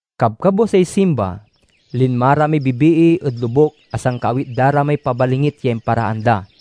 Kabkabwasay Simba, linma ra may bibii ed lobuk a sankaawit da ra may pabalingit ya imparaan da.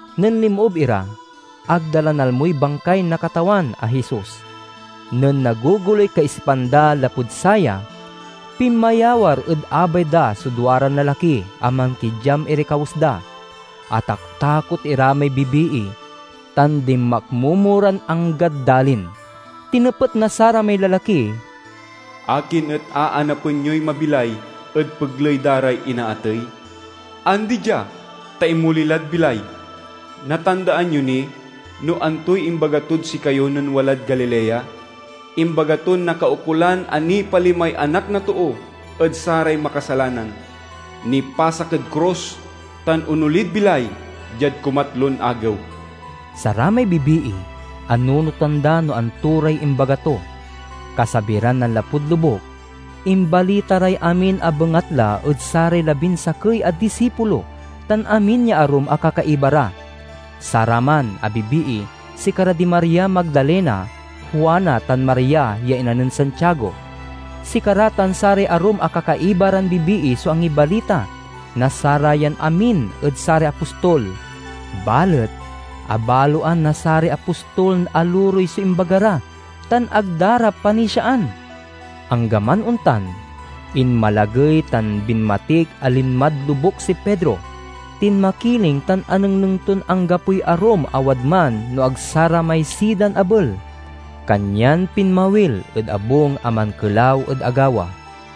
Nen linmoob ira, ag da la nalmoy bangkay na Katawan a Jesus. Nen nagogoloy kaisipan da lapud saya, pinmayawar ed abay da so duaran lalaki a mankidyam iray kawes da. Ataktakot ira may bibii, tan dinmakmomo ran anggad dalin. Tinepet na saramay lalaki, "Akin et aanapen yoy mabilay ed pegley da ray inaatey? Andi dia, ta inmoli lad bilay. Natandaan yo ni no antoy imbaga tod sikayo nen walad Galilea? Imbaga ton nakaukolan a nipalimay Anak na Too ed saray makasalanan, nipasak ed krus, tan onolid bilay diad kumatlon agew!" Saramay bibii anunotan da no anto ray imbaga to. Kasabi ran nanlapud lobuk, imbalita ray amin a bengatla ed saray labinsakey a disipulo tan amin ya arum a kakaiba ra. Saraman a bibii sikara di Maria Magdalena, Juana, tan Maria ya ina nen Santiago. Sikara tan saray arum a kakaiba ran bibii so angibalita na sarayam amin ed saray apostol. Balet, abaloan na saray apostol a lurey so imbaga ra, tan ag da ra panisiaan. Anggaman ontan, inmalagey tan binmatik a linmad lobuk si Pedro. Tinmakiling tan anengneng ton anggapoy arum a wadman no ag saramay sidan abel. Kanyan pinmawil ed abung a mankelaw ed agawa.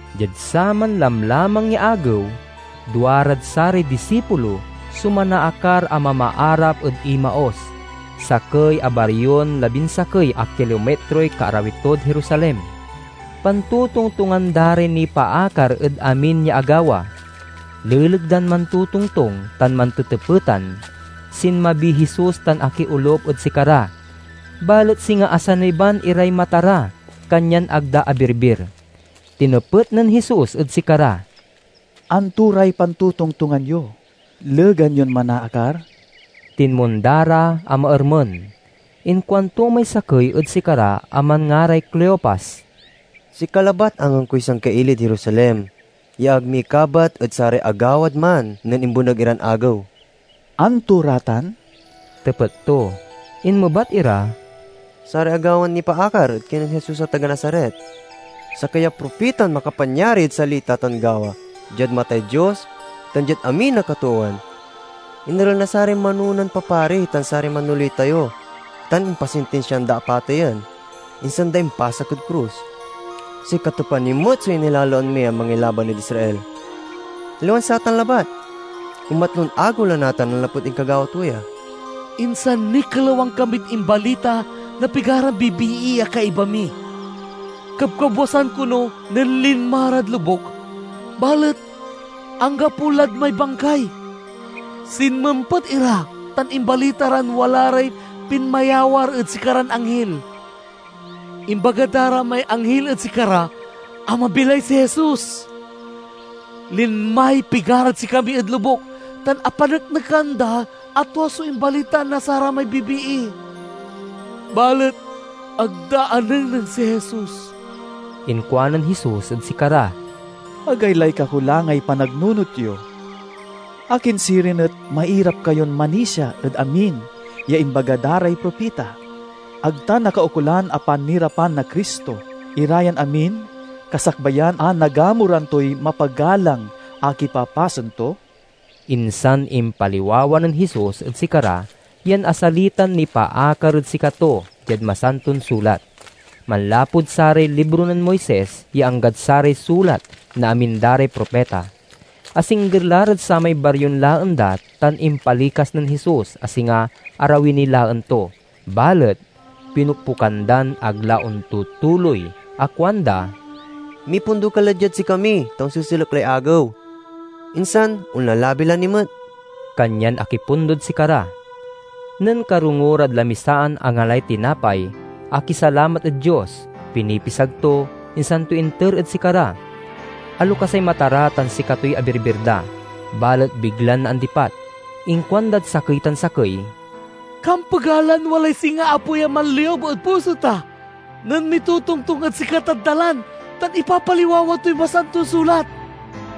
Diad saman lamlamang ya agew, duarad saray disipulo so manaakar a mamaarap ed Emaus, sakey a barion labinsakey a kilomitroy kaarawi tod Jerusalem. Pantotongtongan da ray nipaakar ed amin ya agawa. Leleg dan mantotongtong tan mantetepetan, sinmabiy Jesus tan akiolup ed sikara. Balet singa asaniban iray mata ra, kanyan ag da abirbir. Tinepet nen Jesus ed sikara, "Anto ray pantotongtongan yo, legan yon manaakar?" Tinmonda ra a maermen. Inkuanto may sakey ed sikara a manngaray Cleopas, "Sika labat angangkoy sangkailid Jerusalem ya ag mikabat ed saray agawad man nen imbeneg iran agew!" "Anto ra tan?" tepet to. Inmebat ira, "Saray agawan nipaakar ed kinen Jesus a taga Nazaret, sakey a propitan makapanyari ed salita tan gawa diad matay Dios tan diad amin a katoowan. Inerel na saray manonan papari tan saray manoley tayo, tan impasintinsiaan da a pateyen, insan da impasak ed krus. Sikato pa ni met so inilaloan mi a mangilaban ed Israel! Aliwan satan labat, kumatlon agew la natan nanlapud inkagawa to ya. Insan nikelawan kamid imbalita na pigaran bibii a kaiba mi. Kabkabwasan kono nen linma rad lobuk, balet anggapo lad may bangkay. Sinmempet ira, tan imbalita ran wala ray pinmayawar ed sikaran anghil. Imbaga da ra may anghil ed sikara a mabilay si Jesus. Linmay pigarad sikami ed lobuk, tan apaneknekan da a tua so imbalita na saramay bibii, balet ag da anengneng si Jesus." Inkuanen Jesus ed sikara, "Agaylay kakulangay panagnunot yo! Akin sirin et mairap kayon manisia ed amin ya imbaga da ray propita? Ag ta nakaukolan a panirapan na Cristo ira yan amin kasakbayan a nagamuran toy mapagalang a kipapasen to?" Insan impaliwawa nen Jesus ed sikara yan asalitan nipaakar ed sikato diad Masanton Sulat, manlapud saray libro nen Moises ya anggad saray sulat na amin da ray propita. Asingger la rad samay barion laen da tan impalikas nen Jesus a singa arawi niy laen to. Balet pinokpokan dan ag la ontutuloy a kuanda, "Mipundo ka la diad sikami, ta onseselek lay agew, insan onlalabi la ni met." Kanyan akipundod sikara. Nen karongo rad lamisaan angalay tinapay, akisalamat ed Dios, pinipisag to, insan to inter ed sikara. Alokasay mata ra tan sikatoy abirbir da, balet biglan naandipat. Inkuandad sakey tan sakey, "Kampega lan walay singa apoy a manliub ed puso ta, nen mitotongtong ed sikatad dalan tan ipapaliwawa toy Masanton Sulat."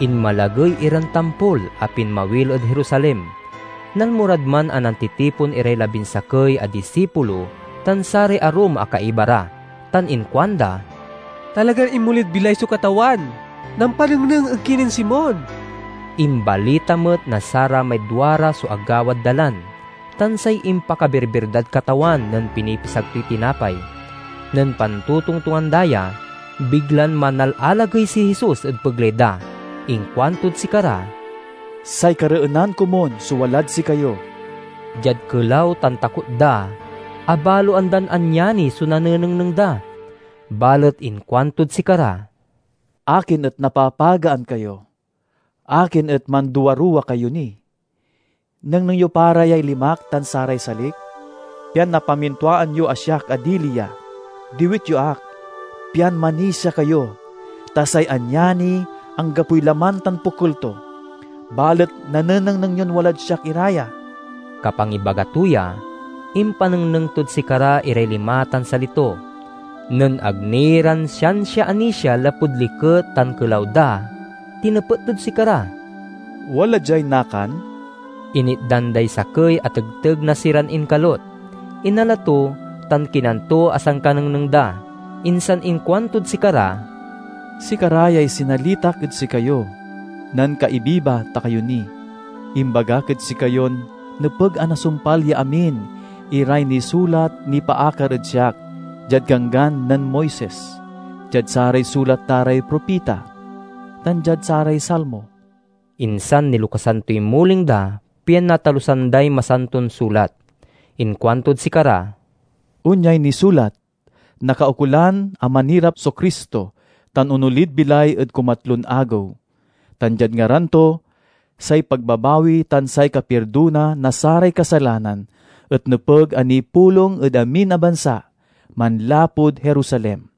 Inmalagey iran tampol a pinmawil ed Jerusalem. Nalmo rad man a nantitipon iray labinsakey a disipulo tan saray arum a kaiba ra tan inkuanda, "Talagan inmolid bilay so Katawan! Nampanengneng ed kinen Simon!" Imbalita met na saramay duara so agawad dalan, tan say impakabirbir dad Katawan nen pinipisag toy tinapay. Nen pantotongtongan da ya, biglan manalalagey si Jesus ed pegley da. Inkuantod sikara, "Say kareenan komun so walad sikayo." Diad kelaw tan takot da, abaloan dan anyani so nanengneng da. Balet inkuantod sikara, "Akin et napapagaan kayo? Akin et manduaruwa kayo ni? Nengneng yo pa ra yay limak tan saray salik, pian napamintuaan yo a siak a dili ya. Diwit yo ak, pian manisia kayo, ta say anyani anggapoy laman tan pokel to, balet nanenengneng yon walad siak ira ya." Kapangibaga to ya, impanengneng tod sikara iray lima tan sali to. Nen ag ni ran siansia anisia lapud liket tan kelaw da, tinepet tod sikara, "Wala diay nakan?" Initdan day sakey a tegteg na siran inkalut. Inala to, tan kinan to a sankanengneng da. Insan inkuantod sikara, "Sikara yay sinalitak ed sikayo nen kaibiba ta kayo ni. Imbagak ed sikayon nepeg a nasumpal ya amin iray nisulat nipaakar ed siak diad Ganggan nen Moises, diad saray sulat da ray propita, tan diad saray Salmo." Insan nilokasan toy muling da, pian natalusan day Masanton Sulat. Inkuantod sikara, "Onyay nisulat: nakaukolan a manirap so Cristo tan onolid bilay ed kumatlon agew, tan diad ngaran to, say pagbabawi tan say kapirdona na saray kasalanan et nepeg a nipulong ed amin a bansa, manlapud Jerusalem.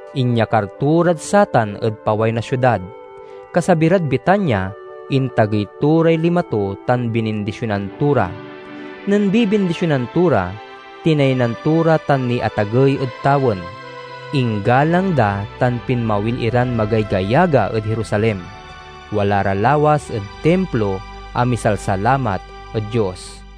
Inyakar to rad satan ed paway na siudad. Kasabi rad Betania, intagey to ray lima to tan binindisionan to ra. Nen bibindisionan to ra, tinaynan to ra tan niatagey ed tawen. Inggalang da tan pinmawil iran magaygayaga ed Jerusalem. Wala ra lawas ed Timplo a misalsalamat ed Dios.